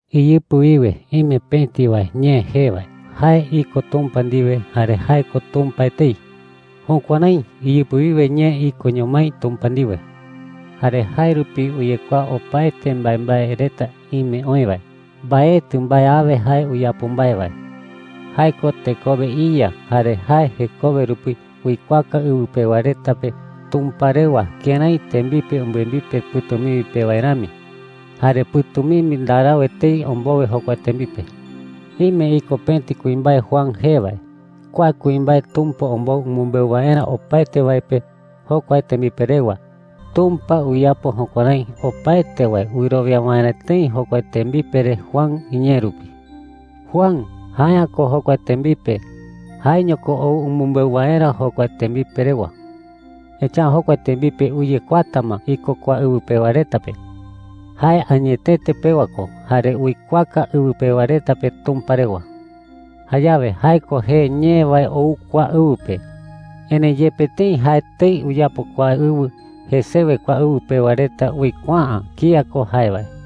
Iyɨpɨ wiwe ime pëti wae Ñee jee wae. Jae iko Tumpa ndiwe jare jae ko Tumpa etei. Jukuärái iyɨpɨ wiwe Ñee ikoño mái Tumpa ndiwe. Jare jae rupi uyekuaa opaete mbaembae reta ime oï wae. Mbaetɨ mbae awe jae uyapo mbae wae. Jae ko tekowe iYa. Jare jae jekowe rupi uikuaaka ɨwɨ pewa reta pe Tumpa rewa kërái tembipe umbɨembipe pɨ̈tumimbi pe wae rami. Jare pɨ̈tumimbi ndarau etei ombowe jokua tembipe. Ime iko pëti kuimbae Juan jee wae. Kua kuimbae Tumpa ombou umɨmbeu waerä opaete wae pe jokua tembipe rewa. Tumpa uyapo jukuärái opaete wae wɨrowia waerä tëi jokua tembipe re Juan iñee rupi. Juan jae’ä ko jokua tembipe. Jaeño ko ou umɨmbeu waerä jokua tembipe rewa. Echa’ä jokua tembipe uyekuaata ma iko kua ɨwɨ pewa reta pe. Jae añetete pewa ko, jare uikuaaka ɨwɨ pewa reta pe Tumpa rewa. Jayawe jae ko jee Ñee wae ou kua ɨwɨ pe. Erëi yepe tëi jae etei uyapo kua ɨwɨ, jesewe kua ɨwɨ pewa reta uikuaa’ä kía ko jae wae.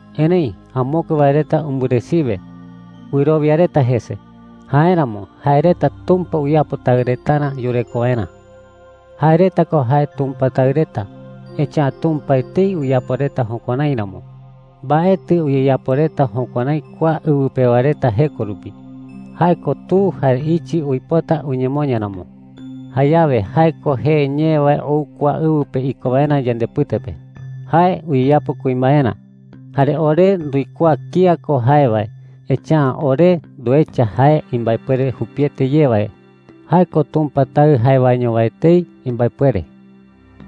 Erëi amokue wae reta umbɨresiwe. Wɨrowia reta jese. Jáeramo jae reta Tumpa uyapo taɨ retarä yureko waerä. Jae reta ko jae Tumpa taɨ reta, echa’ä Tumpa etei uyapo reta jukuärái ramo. Mbaetɨ uyeyapo reta jukuärái kua ɨwɨ pewa reta jeko rupi – jae ko tu jare ichɨ uipota uñemoña ramo. Jayawe jae ko jee Ñee wae ou kua ɨwɨ pe iko waerä yandepɨte pe. Jae uyeyapo kuimbaerä. Jare ore nduikuaa kía ko jae wae, echa’ä ore nduecha jae imbaepuere jupiete ye wae – jae ko Tumpa Taɨ jae waeño wae etei imbaepuere.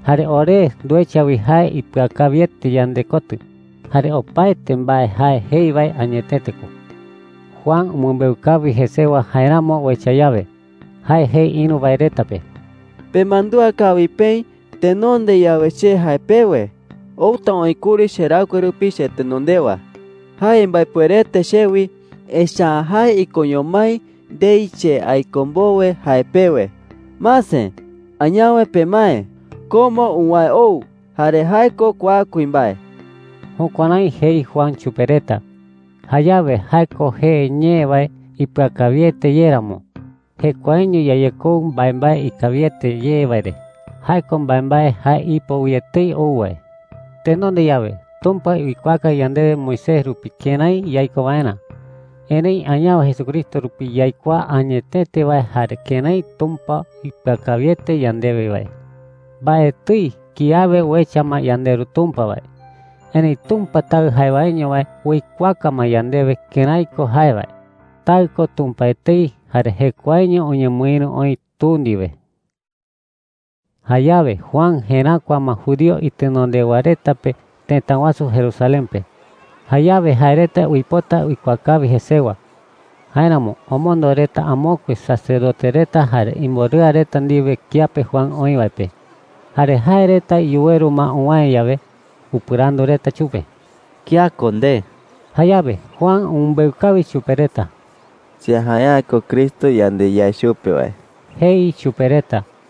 Jare ore nduecha wi jae ipɨakawiete yandekotɨ, jare opaete mbae jae jei wae añetete ko. Juan umɨmbeu kawi jesewa jaeramo uecha yawe. Jae jei ïru wae reta pe: “Pemandúa kawi peï, tenonde yawe che jae pewe: ‘Outa oï kuri cheraɨkue rupi chetenondewa. Jae imbaepuerete chewi, echa’ä jae ikoño mái ndei che aiko mbowe,’ jae pewe. Mase, añawe pemae. Ko ma uwäe ou, jare jae ko kua kuimbae.” Jukuärái jei Juan chupe reta. Jayawe jae ko jee Ñee wae ipɨakawiete ye ramo, jekuaeño yayekou mbaembae ikawiete ye wae re – jae ko mbaembae jae ipo wi etei ou wae. Tenonde yawe Tumpa uikuaaka yandewe Moisés rupi kërái yaiko waerä. Erëi añawe Jesucristo rupi yaikuaa añetete wae jare kërái Tumpa ipɨakawiete yandewe wae. Mbaetɨi kiawe uecha ma yandeRu Tumpa wae. Erëi Tumpa Taɨ jae waeño wae uikuaaka ma yandewe kërái ko jae wae. Taɨ ko Tumpa etei jare jekuaeño uñemɨïru oï Tu ndiwe. Jayawe Juan jeräkua ma judío itenondewa reta pe tëta wasu Jerusalén pe. Jayawe jae reta uipota uikuaa kawi jesewa. Jáeramo omondo reta amokue sacerdote reta jare imborɨa reta ndiwe kiape Juan oï wae pe. Jare jae reta yuweru ma uwäe yawe, upɨrandu reta chupe: “¿Kía ko nde?” Jayawe Juan umɨmbeu kawi chupe reta. “Che jae’ä ko Cristo yande yae chupe wae,” jei chupe reta.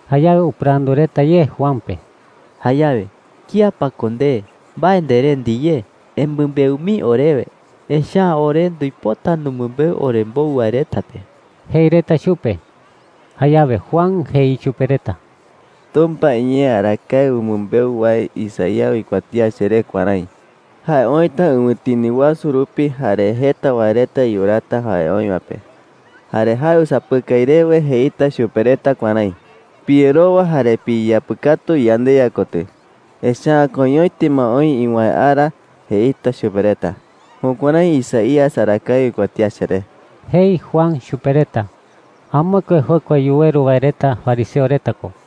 Jayawe upɨrandu reta ye Juan pe: “Jayawe ¿kía pa ko nde? ¿Mbae ndere ndiyé? Emɨmbeu mii orewe, echa’ä ore nduipota numɨmbeu orembou wae reta pe,” jei reta chupe. Jayawe Juan jei chupe reta: “Tumpa iñee arakae umɨmbeu wae Isaías uikuatía cheré kuärái: ‘Jae oïta ɨwɨtini wasu rupi, jare jeta wae reta yuraata jae oï wae pe. Jare jae usapɨkai rewe jeita chupe reta kuärái: ‘Piyerowa jare piyeyapɨkatu yandeYa kotɨ, echa’ä koiñoete ma oï iwäe ara,’ jeita chupe reta.’ Jukuärái Isaías arakae uikuatía cheré,” jei Juan chupe reta. Amokue jokua yuweru wae reta fariseo reta ko.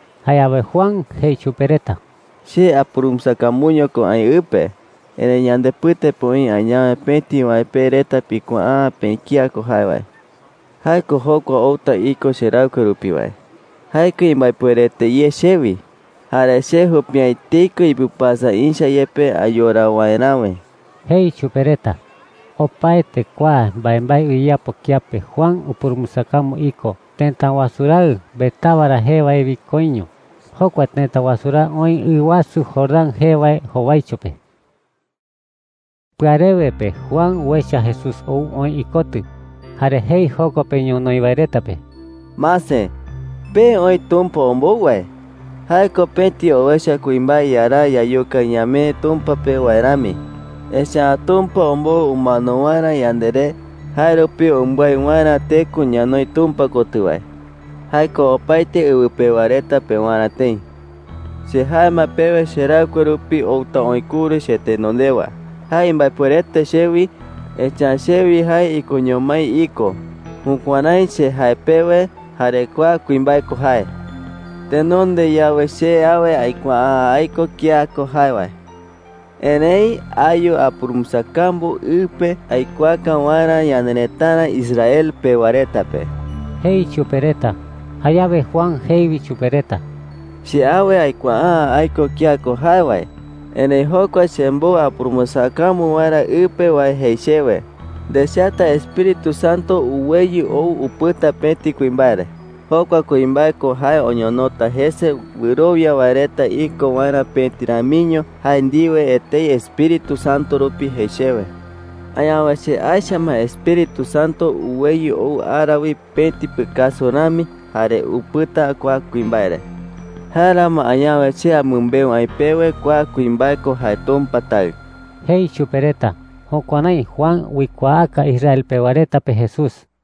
Jayawe Juan jei chupe reta: “Che apurumbɨsakambuño ko aï ɨ pe. Erëi yandepɨte pe oï añawe pëti wae pe reta pikuaa’ä peï kía ko jae wae. Jae ko jokua outa iko cheraɨkue rupi wae. Jae ko imbaepuerete ye chewi. Jare che jupi’ä etei ko ipɨpasa ïcha yepe ayora waeräwe,” jei chupe reta. Opaete kua mbaembae uyeyapo kiape Juan upurumbɨsakambu iko tëta wasu raɨ Betábara jee wae wi koiño. Jokua tëta wasu raɨ oï ɨ wasu Jordán jee wae jowaicho pe. Pɨarewe pe Juan uecha Jesús ou oï ikotɨ, jare jei joko pe ñonoï wae reta pe: “Mase, pee oï Tumpa ombou wae,” jei. “Jae ko pëti owecha kuimbae yaraa yayuka ñamee Tumpa pe wae rami. Echa’ä Tumpa ombou umano waerä yanderé, jae rupi umbái waerä teko ñanoi Tumpa kotɨ wae. Jae ko opaete ɨwɨ pewa reta pewarä tëi,” jei. “Che jae ma pewe cheraɨkue rupi outa oï kuri chetenondewa. Jae imbaepuerete chewi, echa’ä chewi jae ikoño mái iko. Jukuärái che jae pewe, jare kua kuimbae ko jae,” jei Juan chupe reta. “Tenonde yawe che awe aikuaa’ä aiko kía ko jae wae. Erëi ayu apurumbɨsakambu ɨ pe aikuaaka waerä ñanerëtara Israel pewa reta pe,” jei chupe reta. Jayawe Juan jei wi chupe reta: “Che awe aikuaa’ä aiko kía ko jae wae. Erëi jokua chembou apurumbɨsakambu waerä ɨ pe wae jei chewe: ‘Ndechata Espíritu Santo uweyɨ ou upɨta pëti kuimbae re. Jokua kuimbae ko jae oñonota jese wɨrowia wae reta iko waerä pëti ramiño jae ndiwe etei Espíritu Santo rupi,’ jei chewe. Añawe che aecha ma Espíritu Santo uweyɨ ou ara wi pëti pɨkasu rami jare upɨta kua kuimbae re,” jei. “Jáeramo añawe che amɨmbeu aï pewe kua kuimbae ko jae Tumpa Taɨ,” jei chupe reta. Jukuärái Juan uikuaaka Israel pewa reta pe Jesús.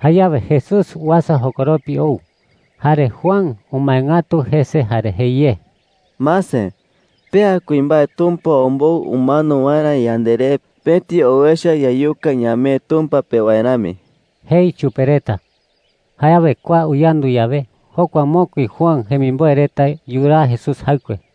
Jayawe Jesús uasa jokoropi ou. Jare Juan umae ngatu jese jare jei ye: “Mase, pea kuimbae Tumpa ombou umano waerä yanderé pëti owecha yayuka ñamee Tumpa pe wae rami,” jei chupe reta. Jayawe kua uyandu yawe, jokua mokui Juan jemimboe reta yuraa Jesús jaɨkue.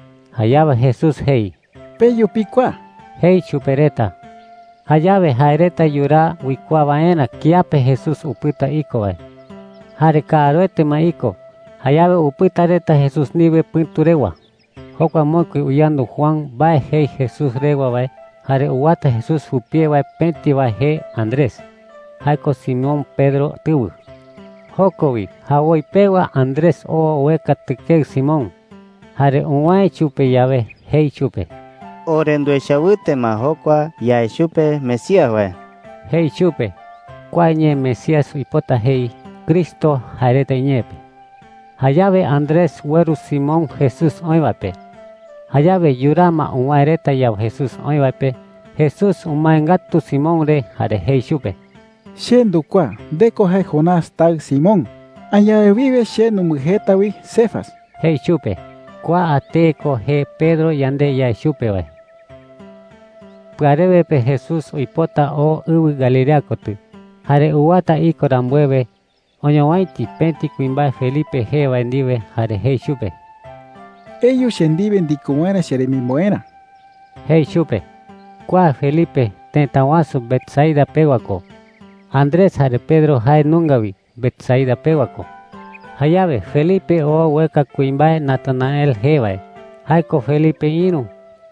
Jayawe Jesús jei: “Peyu pikuaa,” jei chupe reta. Jayawe jae reta yuraa uikuaa waerä kiape Jesús upɨta iko wae. Jare kaaruete ma iko; jayawe upɨta reta Jesús ndiwe pɨ̈tu rewa. Jokua mokui uyandu Juan mbae jei Jesús rewa wae jare uwata Jesús jupie wae, pëti wae jee Andrés. Jae ko Simón Pedro tɨwɨ. Joko wi jawoi pewa Andrés oo ueka tɨkeɨ Simón. Jare uwäe chupe yawe, jei chupe: “Ore nduecha wɨte ma jokua yae chupe Mesías wae,” jei chupe. (Kua ñee Mesías uipota jei ‘Cristo’ jae reta iñee pe.) Jayawe Andrés ueru Simón Jesús oï wae pe. Jayawe yuraa ma uwäe reta yawe Jesús oï wae pe, Jesús umae ngatu Simón re jare jei chupe: “Che ndukuaa. Nde ko Jonás taɨ Simón. Añawe wiwe che numbɨjeeta wi Cefas,” jei chupe. (Kua tee ko jee Pedro yande yae chupe wae.) Pɨarewe pe Jesús uipota oo ɨwɨ Galilea kotɨ. Jare uwata iko rambuewe, oñowäiti pëti kuimbae Felipe jee wae ndiwe jare jei chupe: “Eyu che ndiwe ndiko waerä cheremimboerä,” jei chupe. Kua Felipe tëta wasu Betsaida pewa ko. Andrés jare Pedro jae nunga wi Betsaida pewa ko. Jayawe Felipe oo ueka kuimbae Natanael jee wae – jae ko Felipe ïru.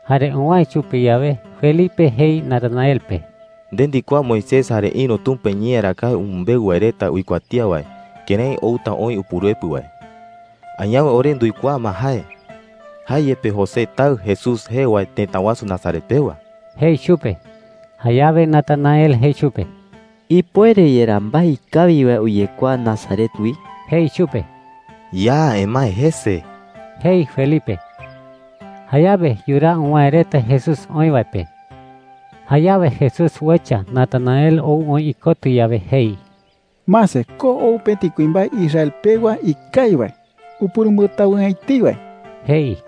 Jare uwäe chupe yawe, Felipe jei Natanael pe: “Nde ndikuaa Moisés jare ïru Tumpa iñee arakae umɨmbeu wae reta uikuatía wae, kërái outa oï Upuruepɨ wae. Añawe ore nduikuaa ma jae. Jae yepe José taɨ Jesús jee wae tëta wasu Nazaret pewa,” jei chupe. Jayawe Natanael jei chupe: “¿Ipuere yerá mbae ikawi wae uyekuaa Nazaret wi?” jei chupe. “Ya emae jese,” jei Felipe. Jayawe yuraa uwäe reta Jesús oï wae pe. Jayawe Jesús uecha Natanael ou oï ikotɨ yawe, jei: “Mase, ko ou pëti kuimbae Israel pewa ikawi wae, upurumbɨtawɨ'ä etei wae,” jei.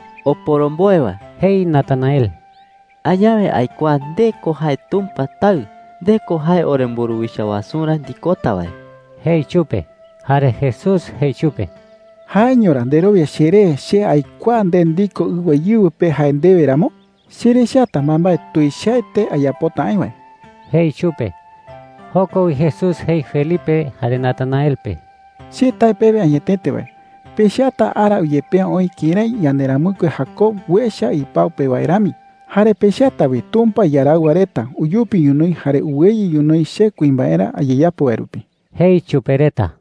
“Oporomboe wae,” jei Natanael, “añawe aikuaa nde ko jae Tumpa Taɨ. Nde ko jae oremburuwicha wasurä ndikota wae,” jei chupe. Jare Jesús jei chupe: “¿Jaeño ra nderowia cheré che aikuaa nde ndiko ɨwa íɨwɨ pe jae ndewe ramo? Cherechata mbaembae tuichaete ayapota aï wae,” jei chupe. Joko wi Jesús jei Felipe jare Natanael pe: “Che tae pewe añetete wae, pechata ara uyepea oï kërái yanderamɨkue Jacob uecha ipau pe wae rami. Jare pechata wi Tumpa iaraɨwa reta uyupi ñonoï jare uweyɨ ñonoï che kuimbaerä ayeyapo wae rupi,” jei chupe reta.